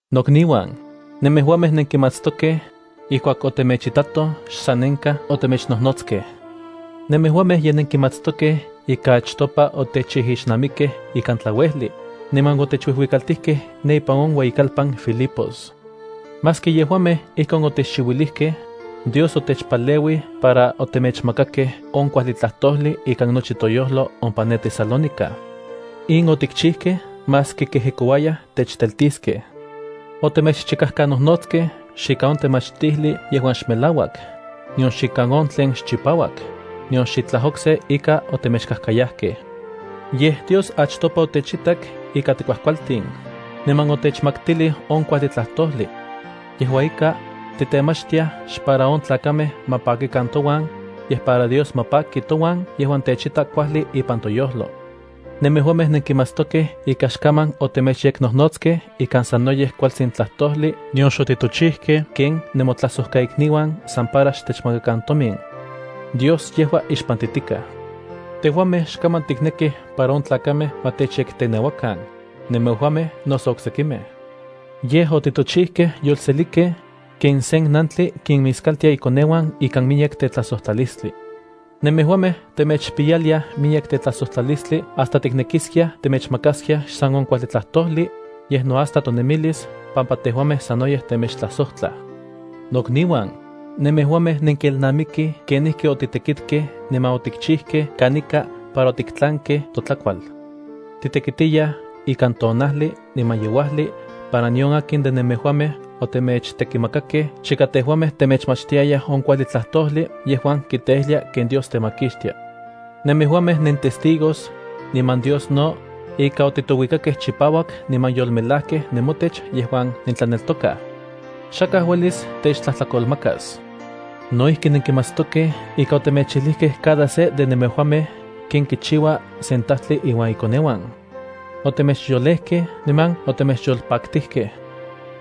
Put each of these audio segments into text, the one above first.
Nokniuan, nemejuamej nenkimatstokej, ijkuak otemechtitatoj xsanenkaj otemechnojnotskej. Nemejuamej ye nenkimatstokej ika achtopa otechijixnamikej ikan tlauejli, niman otechuijuikaltijkej ne ipan on ueyikalpan Filipos. Maski yejuamej ijkon otechchiuilijkej, Dios otechpaleuij para otemechmakakej on kuajli tlajtojli ikan nochi toyojlo ompa ne Tesalónica. In otikchijkej maski kejekouayaj techteltiskej. Otemechchikajkanojnotskej xikan on tlamachtijli yejuan xmelauak, nion xikan on tlen xchipauak, nion xitlaj okse ika otemechkajkayajkej. Yej, Dios achtopa otechitak ika tikuajkualtin, niman otechmaktilij on kuajli tlajtojli. Yejua ika, titemachtiaj xpara on tlakamej ma pakikan touan, yej para Dios ma paki touan yejuan techita kuajli ipan toyojlo. Nemejuamej nenkimatstokej ika xkaman otemechyeknojnotskej ikan sanoyej kualtsin tlajtojli nion xotitochijkej ken nenmotlajsojkaikniuan san para xtechmakakan tomin. Dios yejua ixpantitikaj. Tejuamej xkaman tiknekij para on tlakamej ma techyekteneuakan, nemejuamej noso oksekimej. Yej otitochijkej yolselikej, ken sen nantli kinmiskaltia ikoneuan ikan miyek tetlajsojtlalistli. Nemejuamej temechpiyaliaj miyek tetlajsojtlalistli hasta tiknekiskiaj temechmakaskiaj xsan on kuajli tlajtojli, yej no hasta tonemilis pampa tejuamej sanoyej temechtlajsojtlaj. Nokniuan, nemejuamej nenkelnamikij kenijki otitekitkej niman otikchijkej kanika para otiktlankej totlakual. Titekitiyaj ikan tonajli niman yeuajli para nion akin de nemejuamej otemechtekimakakej chika tejuamej temechmachtiayaj on kuajli tlajtojli yejuan kiteijlia ken Dios temakixtia. Nemejuamej nentestigos, niman Dios no, ika otitouikakej chipauak niman yolmelajkej nemotech yejuan nentlaneltokaj. Xakaj uelis techtlajtlakolmakas. No ijki nenkimatstokej ika otemechijlijkej cada se de nemejuamej ken kichiua sen tajtli iuan ikoneuan. Otemechyolejkej niman otemechyolpaktijkej.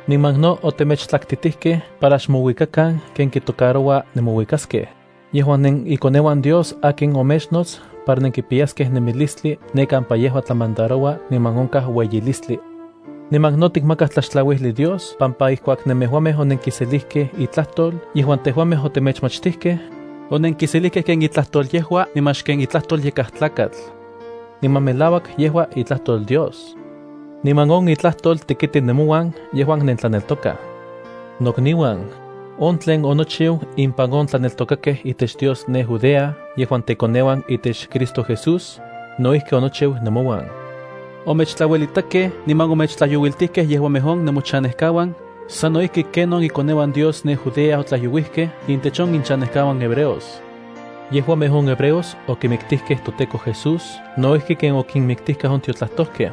Niman no otemechtlaktitijkej para xmouikakan ken kitocaroua nemouikaskej, yejuan nenikoneuan Dios akin omechnots para nenkipiyaskej nemilistli ne kampa yejua tlamandaroua niman onkaj ueyilistli. Niman no tikmakaj tlaxtlauijli Dios pampa ijkuak nemejuamej onenkiselijkej itlajtol yejuan tejuamej otemechmachtijkej, onenkiselijkej ken itlajtol yejua niman xken itlajtol yakaj tlakatl. Niman melauak yejua itlajtol Dios. Niman on itlajtol tekiti nemouan yejuan nentlaneltokaj. Nokniuan, on tlen onochiu impan on tlaneltokakej itech Dios ne Judea yejuan tekoneuan itech Cristo Jesús, no ijki onochiu nemouan. Omechtlauelitakej niman omechtlajyouiltijkej yejuamej on nemochanejkauan sano ijki ken on ikoneuan Dios ne Judea otlajyouijkej intech on inchanejkauan hebreos. Yejuamej on hebreos okimiktijkej toTEKO Jesús no ijki ken okinmiktijkaj on tiotlajtojkej.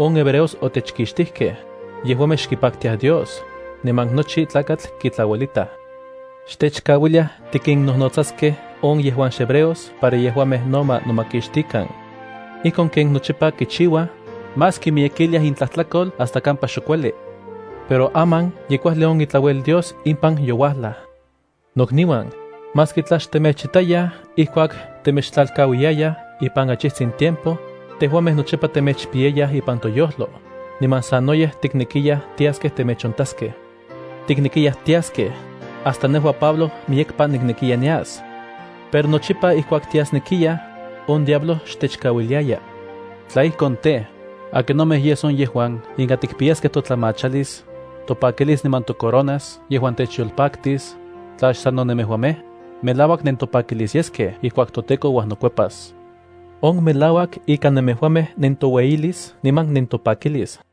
On hebreos otechkixtijkej, xkipaktiaj Dios, niman nochi tlakatl kitlauelitaj. Xtechkauiliaj tikinnojnotsaskej on yejuan xhebreos para yejuamej no ma nomakixtikan. Ijkon ken nochipa kichiuaj, más kimiyekiliaj intlajtlakol hasta kampa xok ueli. Pero aman ye kuajli on itlauel Dios impan youajlaj. Nokniuan, maski tla xtemechitayaj ijkuak temechtlalkauiyayaj ipan achijtsin tiempo, tejuamej nochipa temechpiyayaj ipan toyojlo, niman sanoyej tiknekiyaj tiaskej temechontaskej. Tiknekiyaj tiaskej, hasta nejua Pablo miyekpa niknekiya nias. Pero nochipa ijkuak tiasnekiyaj, on diablo xtechkauiliaya. Tla ijkon tej, ¿akinomej yes on yejuan inka tikpiyaskej totlamachalis, topakilis niman tocoronas yejuan techyolpaktis, tla xsano nemejuamej? Melauak nentopakilis yeskej ijkuak toTEKO uajnokuepas. On melauak ika nemejuamej nentoueyilis niman nentopakilis.